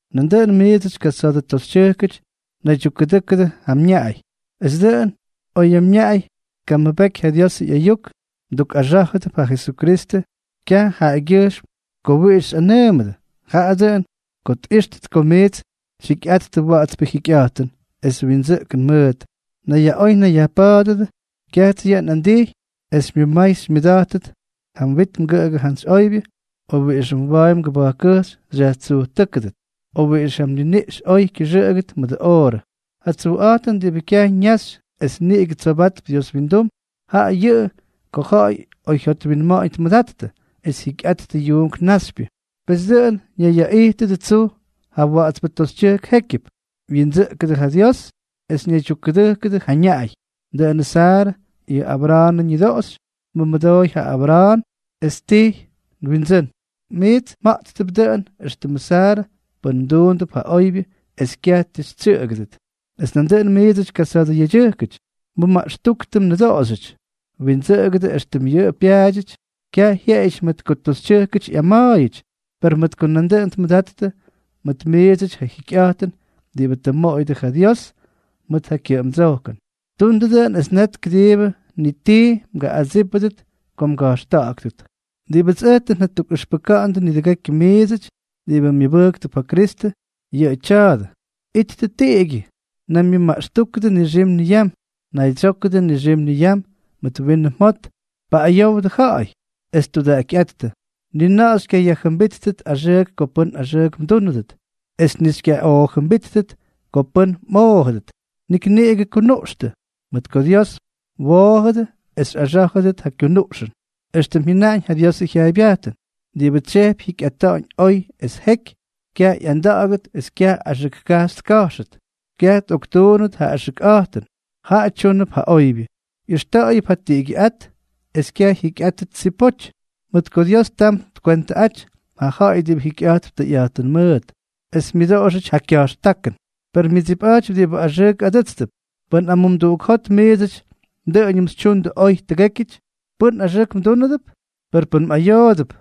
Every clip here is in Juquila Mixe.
Nandʉꞌʉn miidsʉty kasa̱a̱dʉ toxytyʉjkʉty, naydyukkʉdʉ́kʉdʉ ja mñaꞌay, es dʉꞌʉn, oy mñaꞌay tkamʉbʉktʉ ja Diosʉ ꞌyayuk, mdukꞌaxá̱jʉdʉp ja Jesukristʉ kyaj jaꞌagyʉjxm ko wiꞌix xyꞌanʉʉmʉdʉ, jaꞌa dʉꞌʉn ko tꞌíxtʉt ko miits xyjikyꞌattʉ wa̱ꞌa̱tspʉ jikyꞌa̱jtʉn es windsʉꞌkʉn mʉʉt. Nayyaꞌoy nayyajpa̱a̱dʉdʉ. Kyajts yʉꞌʉ nꞌandijy es xymyʉmay xymyʉda̱jtʉt ja mwit mgʉꞌʉgʉ jantsy oybyʉ, o wiꞌixʉ mwa̱a̱y mgʉba̱jkkʉjxy xyajtsujtʉ́kʉdʉt, o wiꞌix ja mniniꞌx oy kyʉxʉꞌʉgʉt mʉdʉ oorʉ. Ja tsujꞌa̱jtʉn diꞌibʉ kyaj ñaxy es niꞌigʉ tsobatp Dios wyindum, jaꞌa yʉꞌʉ ko ja̱ꞌa̱y oyjyot oywyinma̱ꞌa̱ñ tmʉdattʉ es jyikyꞌattʉ yuunk naxypyʉ. Pes dʉꞌʉn ñayyaꞌijtʉdʉ tsuj ja wa̱ꞌa̱tspʉ toxytyʉjk jékyʉp, wyindsʉꞌkʉdʉ ja Dios es ñaydyukkʉdʉjkʉdʉ ja ñaꞌay. Dʉꞌʉnʉ Saarʉ, yʉ Abra̱a̱nʉ ñʉdoꞌoxy, tmʉmʉdooy ja Abra̱a̱n, es ttijy “nwindsʉ́n”. Miits mja̱ꞌttʉp dʉꞌʉn éxtʉmʉ Saarʉ pʉn mduundʉp ja oybyʉ es kyaj ti xytsyʉꞌʉgʉdʉt. Es nandʉꞌʉn miidsʉty kasa̱a̱dʉ yedyʉjkʉty, mʉmaꞌxtúktʉ mnʉdoꞌoxyʉty. Windsʉꞌʉgʉ éxtʉm yʉꞌʉ pyaadyʉty. Kyaj jyeꞌeyʉty mʉt ko toxytyʉjkʉty ꞌyama̱a̱yʉty, per mʉt ko nandʉꞌʉn tmʉdattʉ mʉt miidsʉty ja jikyꞌa̱jtʉn diꞌibʉ tʉ mmoꞌoyʉdʉ ja Dios mʉt ja kyʉꞌʉmdsojkʉn. Tundʉ dʉꞌʉn, es net kʉdiibʉ ni tii mgaꞌꞌadsípʉdʉt ko mga̱jxta̱ꞌa̱ktʉt. Diꞌibʉts ʉj tʉ njatukꞌʉxpʉka̱ꞌa̱ndʉ nidʉgekyʉ miidsʉty diꞌibʉ myʉbʉjktʉp ja Kristʉ, yʉꞌʉ tya̱a̱dʉ: Ittʉ tiꞌigyʉ, naymyʉmaꞌxtúkʉdʉ nixim niyam, naydsyókʉdʉ nixim niyam mʉt winʉ mjot, paꞌꞌayowdʉ ja̱ꞌa̱y, es tudaꞌakyꞌáttʉ. Ni na̱ꞌa̱ xykyayajjʉmbíttʉt axʉʉk ko pʉ́n axʉʉk mdúnʉdʉt, es ni xykyaꞌoojʉmbíttʉt ko pʉ́n mꞌoojʉdʉt. Nik niꞌigʉ kunuꞌxtʉ, mʉt ko Dios mwoojʉdʉ es xyꞌaxá̱jʉdʉt yʉ kunuꞌxʉn. Extʉm jyʉnaꞌañ ja Diosʉ jyaaybyajtʉn: Diꞌibʉ tsyejpy jyikyꞌata̱ꞌa̱ñ oy es jeky, kyaj ꞌyanda̱ꞌa̱gʉt es kyaj axʉk kajxy tka̱jxʉt; kyaj tꞌoktuunnʉt ja axʉkꞌa̱jtʉn; jaꞌa tyúnʉp ja oybyʉ, ꞌyʉxta̱ꞌa̱yʉp ja tiꞌigyʉꞌát, es kyaj jyikyꞌátʉt tsipoty. Mʉt ko Dios tam kywentʉꞌátyʉty ja ja̱ꞌa̱y diꞌibʉ jikyꞌa̱jtp tʉyꞌa̱jtʉn mʉʉt, es myʉdoꞌoxʉty ja kya̱jxtákʉn, per myʉdsipꞌa̱jtypy diꞌibʉ axʉʉk adʉ́tstʉp. Pʉn amumduꞌuk jot miidsʉty dʉꞌʉñʉm xytyundʉ oy tʉgékyʉty, ¿pʉ́n axʉʉk mdúnʉdʉp? Per pʉn mꞌayoodʉp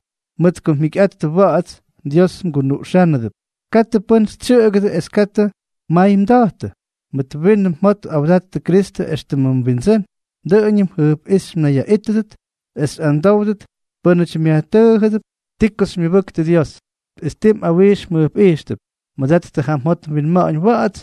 mʉt ko mjikyꞌattʉ wa̱ꞌa̱ts, Dios mgunuꞌxánʉdʉp. Katʉ pʉ́n xytsyʉꞌʉgʉdʉ es katʉ mmay mda̱jtʉ. Mʉt winʉ mjot awdattʉ Kristʉ éxtʉmʉ mWindsʉ́n. Dʉꞌʉñʉm jʉjpꞌíxy mnayyaꞌítʉdʉt es xyꞌadsówdʉt pʉnaty myajtʉʉjʉdʉp ti ko xymyʉbʉktʉ Dios, es ti mꞌawijx mjʉjpꞌijxtʉp. Mʉdattʉ ja mjot mwinma̱ꞌa̱ñ wa̱ꞌa̱ts,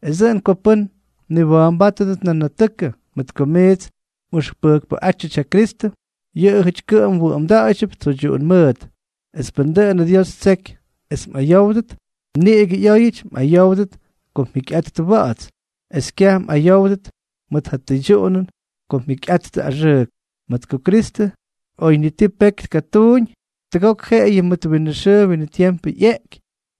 es dʉꞌʉn ko pʉ́n mniwa̱a̱mbátʉdʉt nanatʉkʉ mʉt ko miits mꞌʉxpʉjkpʉꞌátyʉty ja Kristʉ, yʉꞌʉjʉty kʉꞌʉm wʉꞌʉmda̱ꞌa̱ydyʉp tsoydyuꞌun mʉʉt. Es pʉn dʉꞌʉnʉ Dios ttseky es mꞌayówdʉt, niꞌigʉ ꞌyóyʉty mꞌayówdʉt ko mjikyꞌattʉ wa̱ꞌa̱ts, es kyaj mꞌayówdʉt mʉt ja tʉydyuꞌunʉn ko mjikyꞌattʉ axʉʉk. Mʉt ko Kristʉ, oy ni ti peky tkatuuñ, tʉgok jeꞌeyʉ mʉt winʉ xʉʉ winʉ tiempʉ ꞌyeꞌky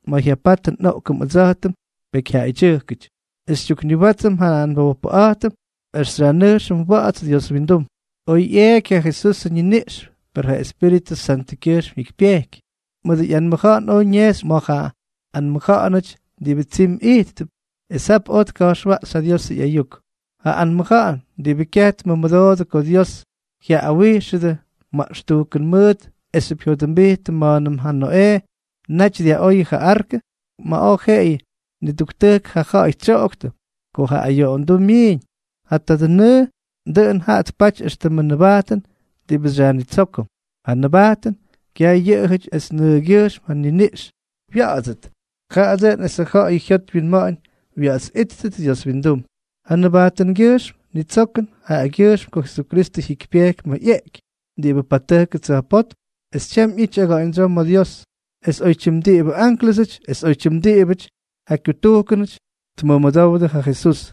ma̱ jyapatʉ nꞌoꞌkʉm ʉdsa̱jtʉm pekyjyaꞌayʉty, es xytyukniwátsʉm ja nbojpʉꞌa̱jtʉm es xyajnʉjxʉm wa̱ꞌa̱ts Dios wyindum. Oj ꞌyeeky ja Jesusʉ ñiniꞌx, per Espíritʉ Santʉkyʉjxm jyikypyejky. Mʉdʉ ꞌyanmʉja̱ꞌa̱n oj ñejxy ma̱ ja anmʉja̱ꞌa̱nʉty diꞌibʉ tsimy ijttʉp, es jap oj tka̱jxwaꞌxy ja Diosʉ ꞌyayuk, ja anmʉja̱ꞌa̱n diꞌibʉ kyaj tmʉmʉdoodʉ ko Dios jyaꞌꞌawijxʉdʉ maꞌxtujkʉn mʉʉt esxyʉp jyodʉmbijttʉ ma̱a̱nʉm ja Noꞌee naty dyaꞌoyʉ ja arkʉ, ma̱ oj jeꞌeyʉ niduktujk ja ja̱ꞌa̱y tsyoꞌoktʉ ko ja ayoꞌonduu myiiñ. Ja tadʉ nʉʉ, dʉꞌʉn jaꞌa tpaty éxtʉmʉ nʉbajtʉn diꞌibʉ xyajnitsókʉm. Ja nʉbajtʉn, kyaj yʉꞌʉjʉty es nʉʉgyʉjxm ja niniꞌx wya̱ꞌa̱tsʉt, jaꞌa dʉꞌʉn esʉ ja̱ꞌa̱y jyot wyinma̱ꞌa̱ñ wa̱ꞌa̱ts ꞌyíttʉt Dios wyindum. Ja nʉbajtʉngyʉjxm nnitsókʉm jaꞌagyʉjxm ko Jesukristʉ jyikypyeky ma̱ ꞌyeꞌky, diꞌibʉ patʉjkʉ tsa̱jpótm es tyam ꞌyity aga̱ꞌa̱ñdsyoo ma̱ Dios, es oytyim diꞌibʉ ánklʉsʉty es oytyim diꞌibʉty ja kyutujkʉnʉty tmʉmʉdowdʉ ja Jesús.